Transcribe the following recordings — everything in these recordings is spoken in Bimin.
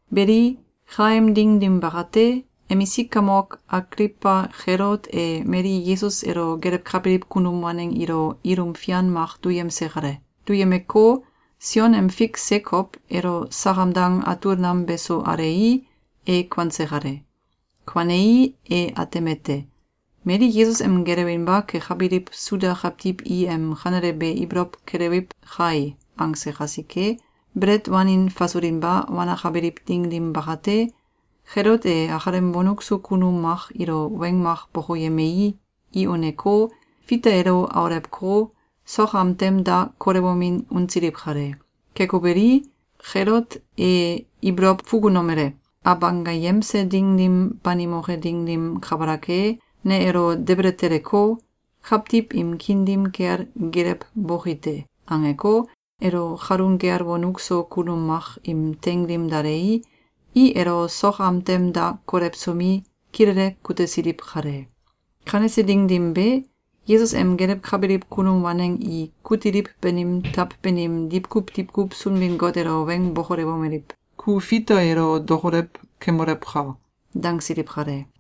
Beli, kaem ding dim bakate, emisik kamok Agliwba Kelot e mali Yesus elo gelewkabiliw kunum waneng ilo ilum fian mak duyemse kale. Duyemeko, Sion em fik Sekow elo sakam dang atul nam beso alei, e kuanse kale. Kuanei, e atemete: ‘Mali Yesus em gelewinba kekabiliw Suda kawtiw i em kanele be ibolow kelewiw kai!’, angse kasike, belet wanin fasulinba wanakabiliw ding dim bakate, Kelot e akalem wonuk so kunum mak ilo weng mak bokoyemei, i uneko, Fita elo aulewko, sok am tem da kolewomin unsiliw kale. Keko beli, Kelote e ibolow fukunomele: “Abanggayemse Ding dim banimoke ding dim kabalak e, ne elo debele teleko, kawtiw im kiin dim kel geelewboki te.”, angeko, elo kalun kel wonuk so kunum mak im teing dim dalei, i elo sok am tem da kolewsomi, kilele kutesiliw kale. Kanese ding dim be, Yesus em gelewkabiliw kunum waneng i kutiliw banim taw banim diwkuw diwkuw Sunbin-Got elo weng bokolewomeliw: “Ku Fita elo dokolew kemolewka!”, dangsiliw kale.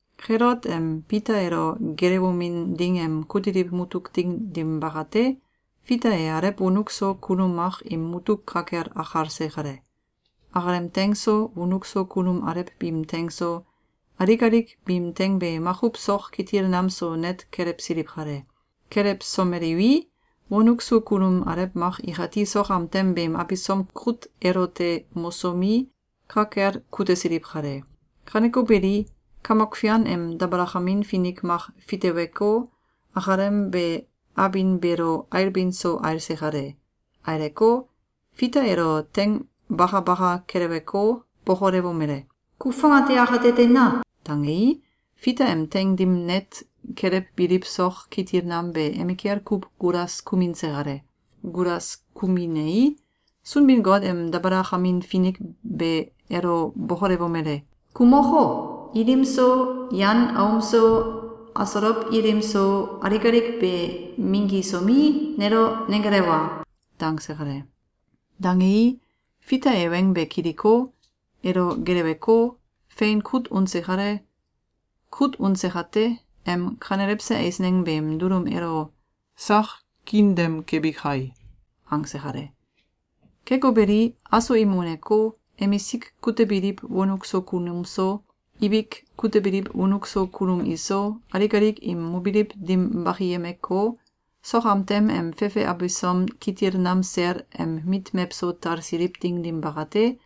Kelot em Fita elo geelewomin ding em kutiliw mutuk ding dim bakate, Fita e alew wonuk so kunum mak im mutuk ka kel akalse kale. Akalem teing so, wonuk so kunum alew biim teing so, alik alik biim teing be makuw sok kitil nam so net kelewsiliw kale. Kelewsomeliwi, wonuk so kunum alew mak ikati sok am tem beem abisom kut elote mosomi, ka kel kutesiliw kale. Kaneko beli, Kamok Fian em dabalakamin finik mak fiteweko, akalem be abin beelo ailbin so ailse kale. Aileko, Fita elo teing bakabaka keleweko, bokolewomele: “Ku fongate akate teina!”, dangei, Fita em teing dim net kelewbiliw sok kitil nam be emikel kuw gulas kuminse kale. Gulas kuminei, Sunbin-Got em dabalakamin finik be elo bokolewomele: “Ku moko, ilim so, yan aom so, asolow ilim so, alik alik be minggisomi, nelo nenggelewa!”, dangse kale. Dangei, Fita e weng be kiliko, elo geleweko, fein kut unse kale. Kut unse kate, em kanelewse eisneng beem dulum elo “Sak kiin dem kebi kai!”, angse kale. Keko beli, aso im uneko, emisik kutebiliw wonuk so kunum so, ibik kutebiliw wonuk so kunum iso, alik alik im mobiliw dim bakiyemeko, sok am tem em fefe abisom kitil nam sel em mit mewso talsiliw ding dim bakate,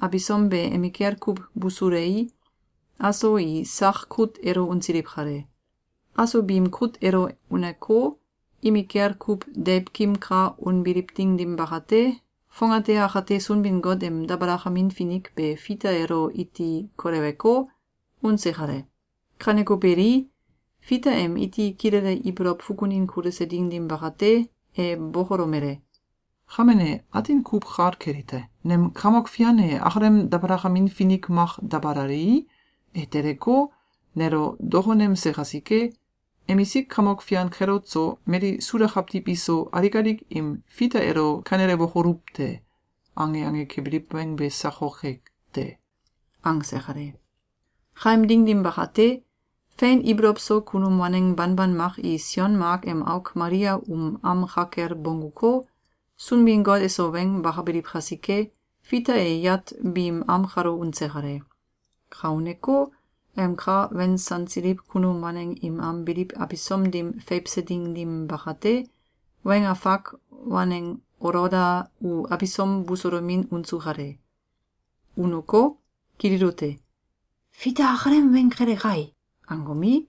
abisom be emikel kuw busulei, aso i sak kut elo unsiliw kale. Aso biim kut elo uneko, imikel kuw deiwkim ka unbiliw ding dim bakate, fongate akate Sunbin-Got em dabalakamin finik be Fita elo iti koleweko, unse kale. Kaneko beli, Fita em iti kilele ibolow fukunin kuluse ding dim bakate, e bokolomele: “Kame ne atin kuw kal kelite: Nem Kamok Fian e akalem dabalakamin finik mak dabalalei, e teleko, nelo dokonemse kasike, emisik kamok fian Kelot so, mali Suda kawtiw iso, alik alik im ‘Fita elo kanelewokoluw te!’, ange ange kebiliw weng be sakoke te.”, angse kale. Kaem ding dim bakate, fein ibolow so kunum waneng banban mak i Sion Mak em auk Malia um am ka kel bongguko, Sunbin-Got eso weng bakabiliw kasike, Fita e yat biim am kalo unse kale. Ka uneko, em ka wensansiliw kunum waneng im am biliw abisom dim feiwse ding dim bakate, weng afak waneng Oloda u abisom busulomin unsu kale. Uneko, kililute: “Fita akalem weng kele kai!”, angomi,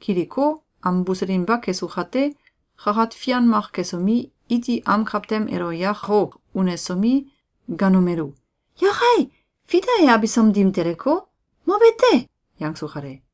kiliko, am buselinba kesu kate, kakat fian mak kesomi, iti am kawtem elo yako unesomi, gaanomelu: “Yakai! Fita e abisom dim teleko, mobe te!”, yangsu kale.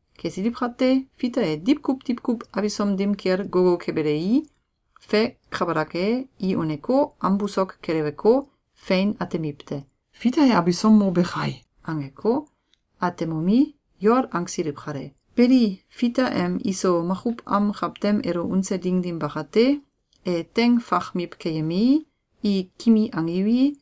Kesiliw kate, Fita e diwkuw diwkuw abisom dim kel gogo kebelei, fe kabalak e, i uneko, am busok keleweko, fein atemiwte: “Fita e abisom mobe kai!”, angeko, atemomi, yol angsiliw kale. Beli, Fita em iso makuw am kawtem elo unse ding dim bakate, e teing fakmiw keyemei, i kimi angiwi,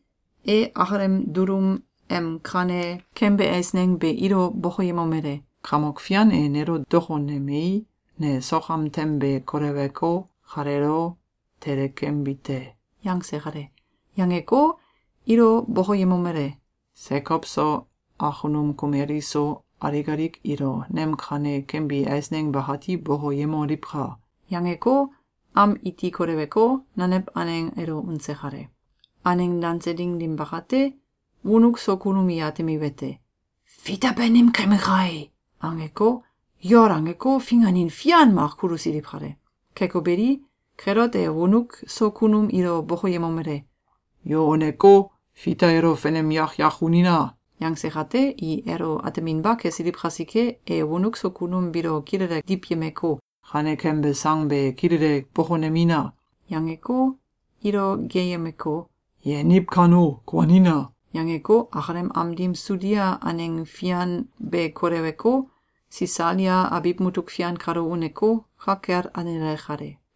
e akalem dulum em kane kembe eisneng be ilo bokoyemomele: “Kamok Fian e nelo dokonemei, ne sok am tem be koleweko, kaleelo tele kembi te.”, yangse kale. Yangeko, ilo bokoyemomele: “Sekow so, akunum kumel iso, alik alik ilo nem kane kembi eisneng bakati bokoyemoliwka!”, yangeko, am iti koleweko, nanew aneng elo unse kale. Aneng danse ding dim bakate, wonuk so kunum i atemiwete: “Fita banim kembe kai!”, angeko, yol angeko, finganin fian mak kulusiliw kale. Keko beli, Kelot e wonuk so kunum ilo bokoyemomele: “Yu uneko, Fita elo fenem yak yak unina!”, yangse kate, i elo ateminba kesiliw kasike, e wonuk so kunum biilo kilele diwyemeko, “Kane kembe sang be kilele bokonemina!”, yangeko, ilo geeyemeko, “Yeniw kano, kuanina!”, yangeko, akalem am dim Sudia aneng fian be koleweko, Sisalia abiw mutuk fian kalo uneko, ka kel alenale kale.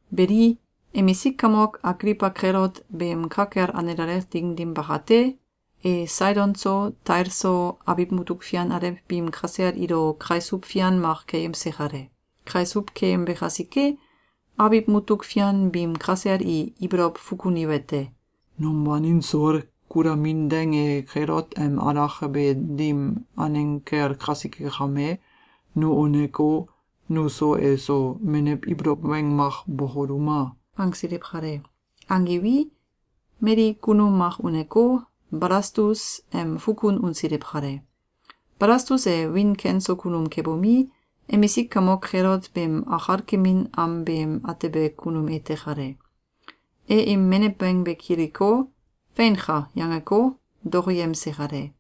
Beli, emisik kamok Agliwba Kelot beem ka kel alenale ding dim bakate, e Saidon so, Tail so, abiw mutuk fian alew biim kasel ilo kaisuw fian mak keyemse kale. Kaisuw keyembe kasike, abiw mutuk fian biim kasel i ibolow fukuniwete: “Num wanin soul kulamin deng e Kelot em alakabe dim aneng kel kasike kame, nu uneko, nuso eso menew ibolow weng mak bokoluma!”, angsiliw kale. Angiwi, mali kunum mak uneko, Balastus em fukun unsiliw kale. Balastus e wiin ken so kunum kebomi, emisik kamok Kelot beem akalkemin am beem atebe kunum ete kale. E im menew weng be kiliko, “Feinka!”, yangeko, dokoyemse kale.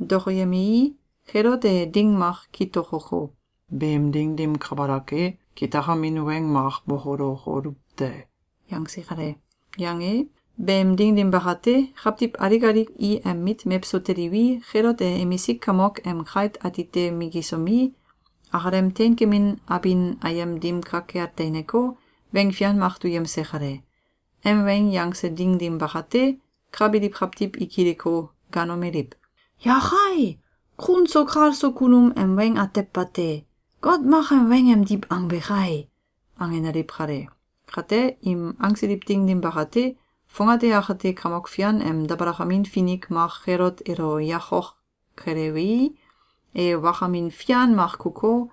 Dokoyemei, Kelot e ding mak kitokoko, “Beem ding dim kabalak e, kitakamin weng mak bokolokoluw te!”, yangse kale. Yange, beem ding dim bakate, kawtiw alik alik i em mit mewso teliwi, Kelot e emisik kamok em kait atite minggisomi, akalem teinkemin abin ayem dim ka kel teineko, weng fian mak duyemse kale. Em weng yangse ding dim bakate, ka biliw kawtiw i kiliko, gaanomeliw: “Yakai! Kun so kal so kunum em weng atew bate! Got mak em weng emdiw angbe kai!”, angenaliw kale. Kate, im angsiliw ding dim bakate, fongate akate Kamok Fian em dabalakamin finik mak Kelot elo yakok kelewei, e wakamin fian mak kuko,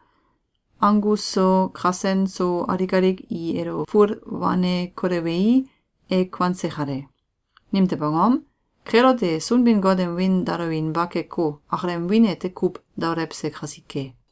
anggus so, kasen so, alik alik i elo ful wane kolewei, e kuanse kale. Nimtew angom? Kelot e Sunbin-Got em wiin daolewinba keko, akalem wiin ete kuw daolewse kasike.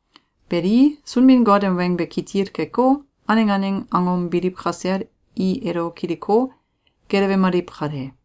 Beli, Sunbin-Got em weng be kitil keko, aneng aneng angom biliw kasel i elo kiliko, gelewemaliw kale.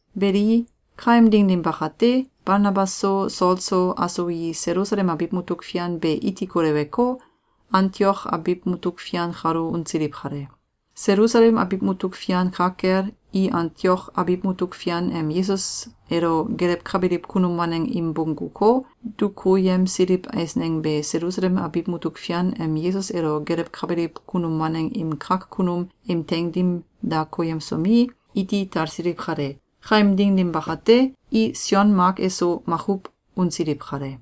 Beli, kaem ding dim bakate, Balnabas so, Sol so, aso i Selusalem abiw mutuk fian be iti koleweko, Antiok abiw mutuk fian kalo unsiliw kale. Selusalem abiw mutuk fian ka kel, i Antiok abiw mutuk fian em Yesus elo gelewkabiliw kunum waneng im bongguko, dukuyemsiliw eisneng be Selusalem abiw mutuk fian em Yesus elo gelewkabiliw kunum waneng im kak kunum im teing dim da koyemsomi, iti talsiliw kale. Kaem ding dim bakate, i Sion Mak eso makuw unsiliw kale.